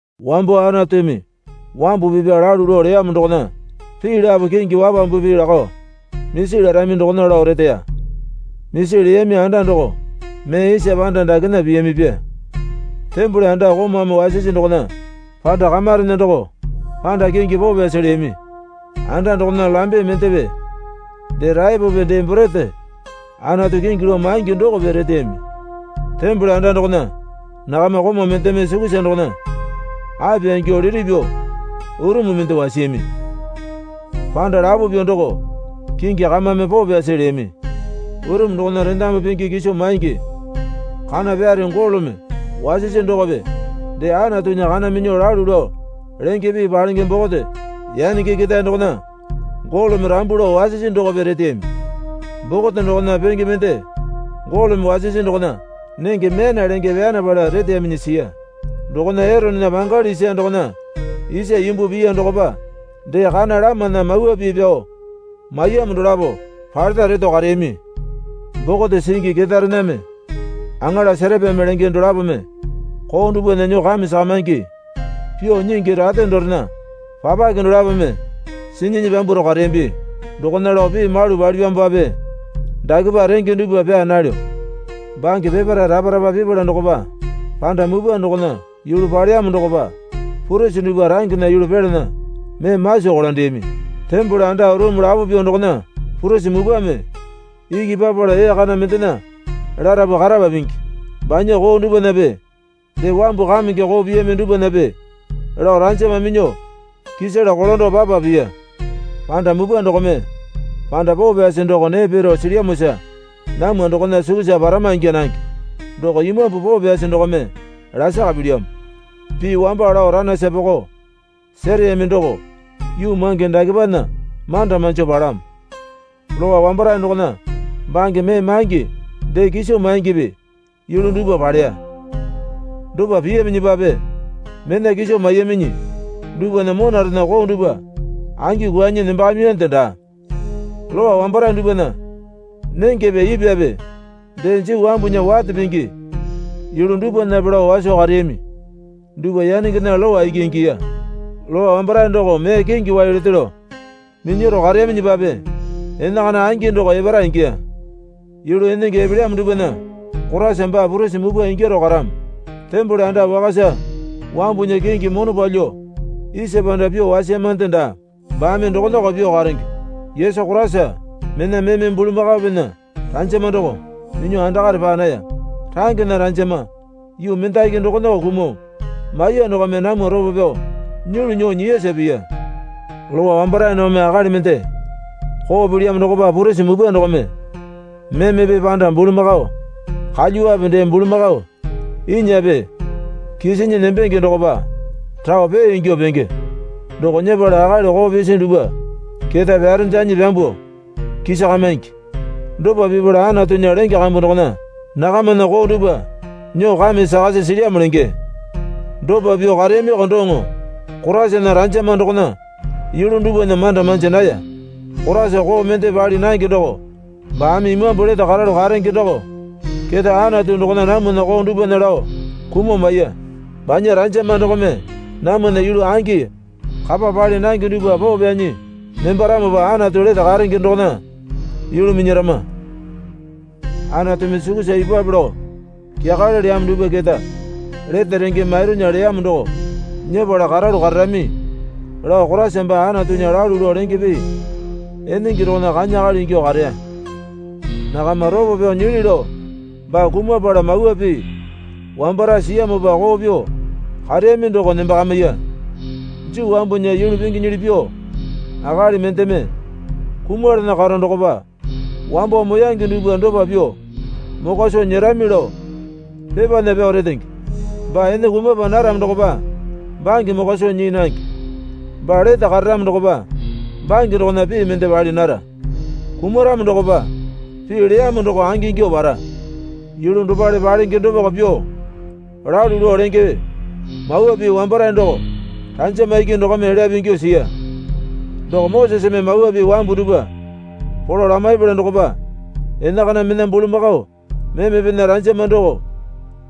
Wambo Anatumi wambu pipa lalu lao leyamo dokona pii lapo kingi wapambupi lakao misi larami dokona lao reteya. Misi leyami anda doko mee isa panda dakena piyamipya. Tembole anda komaumi wasisi dokona panda kamarena doko panda kingi poo pyasi leyami. Anda dokona lambe mendepe dee raepope dee borete Anatu kingi lao maingi dokope reteyami. Tembole anda dokona nakama komau mendeme sukusa dokona apya ingyuo liti pyuo urumu mende wasiyami. Panda lapo pyuo doko kingi Kamame Poo Pyasi leyami. Urumu dokona rendamu pingi kiso maingi kana pyare golome wasisi dokope dee Anatunya Kana Minyuo Lalu Lao Lenge Pii Palenge Bokote, yanenge ketae dokona golome rambu lao wasisi dokope reteyami. Bokote dokona penge mende golome wasisi dokona nenge myana lenge pyanapala reteyaminyi siya. Dokona Eronena pangali isa dokona isa imbu piya dokopa dee kana lamana mawa pii pyao maiyamo dolapo paleta reto kareyami. Bokote singi ketaerename aŋala serapeme lenge dolapome koo dupwana nyuo kame sakamaingi pyuo nyingi rate dorena papake dolapome sinyinyi pyambwaro kareyambi. Dokona lao pii malu palipyamopape dakepa renge dupwa pyaa nalyo. Bange peparae rapa rapa pipala dokopa panda mupwa dokona yulu paleyamo dokopa purisi dupwa rangena yulu pelana mee maso kolandeyami. Tembole anda urumu lapo pyuo dokona purisi mupwame iki papala ee kana mendena larapu karapa pingi. Banya koo dupwanape dee wambu kamenge koo piyami dupwanape lao ranjama minyuo kisala kolando papa piya. Panda mupwa dokome panda poo pyasi doko nee piro silyamosa namwa dokona sukusa parama ingya nange doko Imambu Poo Pyasi dokome lasaka pilyamo. Pii wamba lao ranaisa poko sereyami doko yuu mange dakepana manda manjo palamo. Lowa wambarae dokona bange mee maingi dee kiso maingipi yulu dupwa paleya. Dopa piyaminyipape mena kiso maiyaminyi dupwana monarena koo dupwa angi kwuanyi nembakamiyande daa. Lowa wambarae dupwana nengepe ipwape dee Juu wambunya wate pingi yulu dupwanape lao waso kareyami dupwa yanengena lowa iki ingiya. Lowa wambarae doko mee kingi wai lete lao minyaro kareyaminyipape enakana angi doko epara ingiya. Yulu enenge epelyamo dupwana Koraisa baa purisi mupwa ingyaro karamo. Tembole anda wakasa wambunya kingi mono palyuo isa panda pyuo wasiyamande daa baame dokonako pyuo karenge. Yesu Koraisa mena meme bulamakaopena rajama doko minyuo andakare paa naya. Rangena ranjama yuu mendaki dokonako kumuo maiya dokome namwa ropo pyao nyulu nyuo nyiyasa piya. Lowa wambarae dokome akali mende koo pilyamo dokopa purisi mupwa dokome memepe panda bulamakao kalyuwape dee bulamakao inyape kisinyi nembenge dokopa rao pee ingyuo penge doko nyepala akali koo pisi dupwa keta pyarendanyi pyambuo kisakamaingi. Dopa pipala Anatunya lenge kambu dokona nakamana koo dupwa nyuo kame sakasi silyamo lenge. Dopa pyuo kareyamiko doŋo Koraisana ranjama dokona yulu dupwana manda manji naya. Koraisa koo mende pali nange doko baame Imambu lete karalu karenge doko keta Anatu dokona namwana koo dupwana lao kumuo maiya. Banya ranjama dokome namwana yulu angi kapa pali nange dupwa poo pyanyi nembaramopa Anatu lete karenge dokona yulu minyarama. Anatumi sukusa ipupwape lao kyakale leyamo dupwa keta lete renge mairunya leyamo doko nyepala karalu kararami lao Koraisa baa Anatunya lalu lao lenge pii enenge dokona kanya akali ingyuo kareya. Nakama ropo pyao nyili lao baa kumapala mawa pii wambarae siyamopa koo pyuo kareyami doko nembakamiya. Juu wambunya yulu pinginyili pyuo akali mendeme kumalana karo dokopa wambo moyange dupwa dopa pyuo mokwa soo nyerami lao pepana pyao retenge. Baa ene kumapa naramo dokopa bange mokwa soo nyii nange. Baa lete kararamo dokopa bange dokona pii mende pali nara. Kumaramo dokopa pii leyamo doko angingyuo para. Yulu dopale palenge dopako pyuo lalu lao lenge mawa pii wambarae doko ranjama iki dokome elyape ingyuo siya. Doko Moseseme Mawa Pii wambu dupwa polo lamaipala dokopa enakana mena bulamakao memepena ranjama doko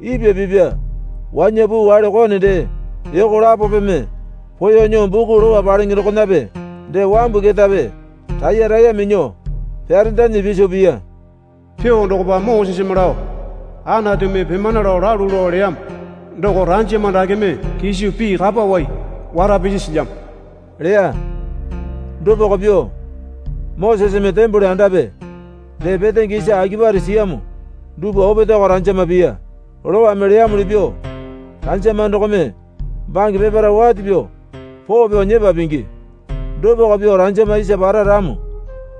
ipwa pipa wanya puu wale kone dee yoko lapopeme poeyuo nyuo buku lowa palenge dokonape dee wambu ketape raiye raiye minyuo pyarendanyi piso piya. Pyuo dokopa Moseseme lao Anatumi pimana lao lalu lao leyamo doko ranjama dakeme kiso pii kapa wai wara pisi silyamo leya. Dopako pyuo Moseseme tembole andape dee petenge isa akipare siyamo dupwa opetaeko ranjama piya. Lowame leyamuli pyuo ranjama dokome bange peparae wate pyuo poo pyao nyepa pingi. Dopako pyuo ranjama isa para ramo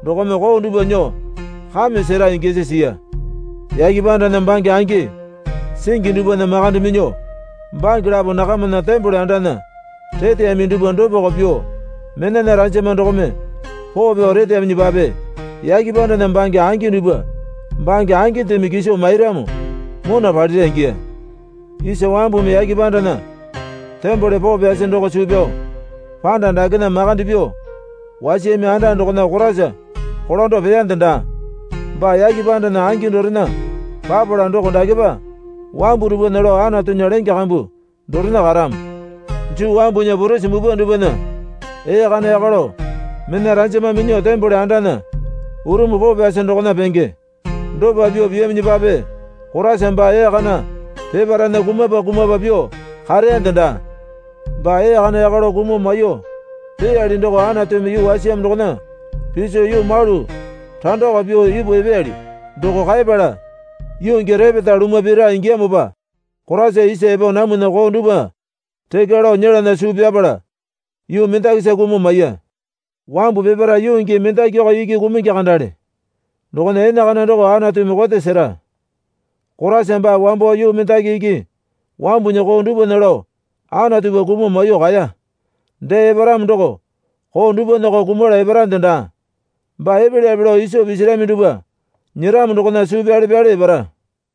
dokome koo dupwa nyuo kame sera ingyasi siya. Yake pandana bange angi singi dupwana makande minyuo bange lapo nakamana tembole andana reteyami dupwa dopako pyuo menana ranjama dokome poo pyao reteyaminyipape yake pandana bange angi dupwa bange angindeme kiso mairamo mona palira ingiya. Isa wambumi yake pandana tembole poo pyasi doko suu pyao panda dakena makande pyuo wasiyami anda dokona Koraisa kolando peyande daa. Baa yake pandana angi dorena papala doko dakepa wambu dupwana lao Anatunya lenge kambu dorena karamo. Juu wambunya purisi mupwa dupwana ee kana yaka lao mena ranjama minyuo tembole andana urumu poo pyasi dokona penge. Dopa pyuo piyaminyipape Koraisa baa ee kana peparaena kumapa kumapa pyuo kareyande daa. Baa ee kana yaka lao kumuo maiyuo peyali doko Anatumi yuu wasiyamo dokona piso yuu malu randako pyuo ipu epeyali. Doko kaepala yuu gii repeta lumwa pira ingiyamopa Koraisa isa epo namwana koo dupwa rekya lao nyelana suu pyapala yuu mendakisa kumuo maiya. Wambu peparae yuu gii mendakiko iki kumungi kandale dokona enakana doko Anatumi kote sera. Koraisa baa wambo yuu mendaki iki wambunya koo dupwana lao Anatupa kumuo maiyuo kaeya. Dee eparamo doko koo dupwanako kumala eparande daa. Baa epelyape lao iso pisarami dupwa nyeramo dokona suu pyale pyale epara.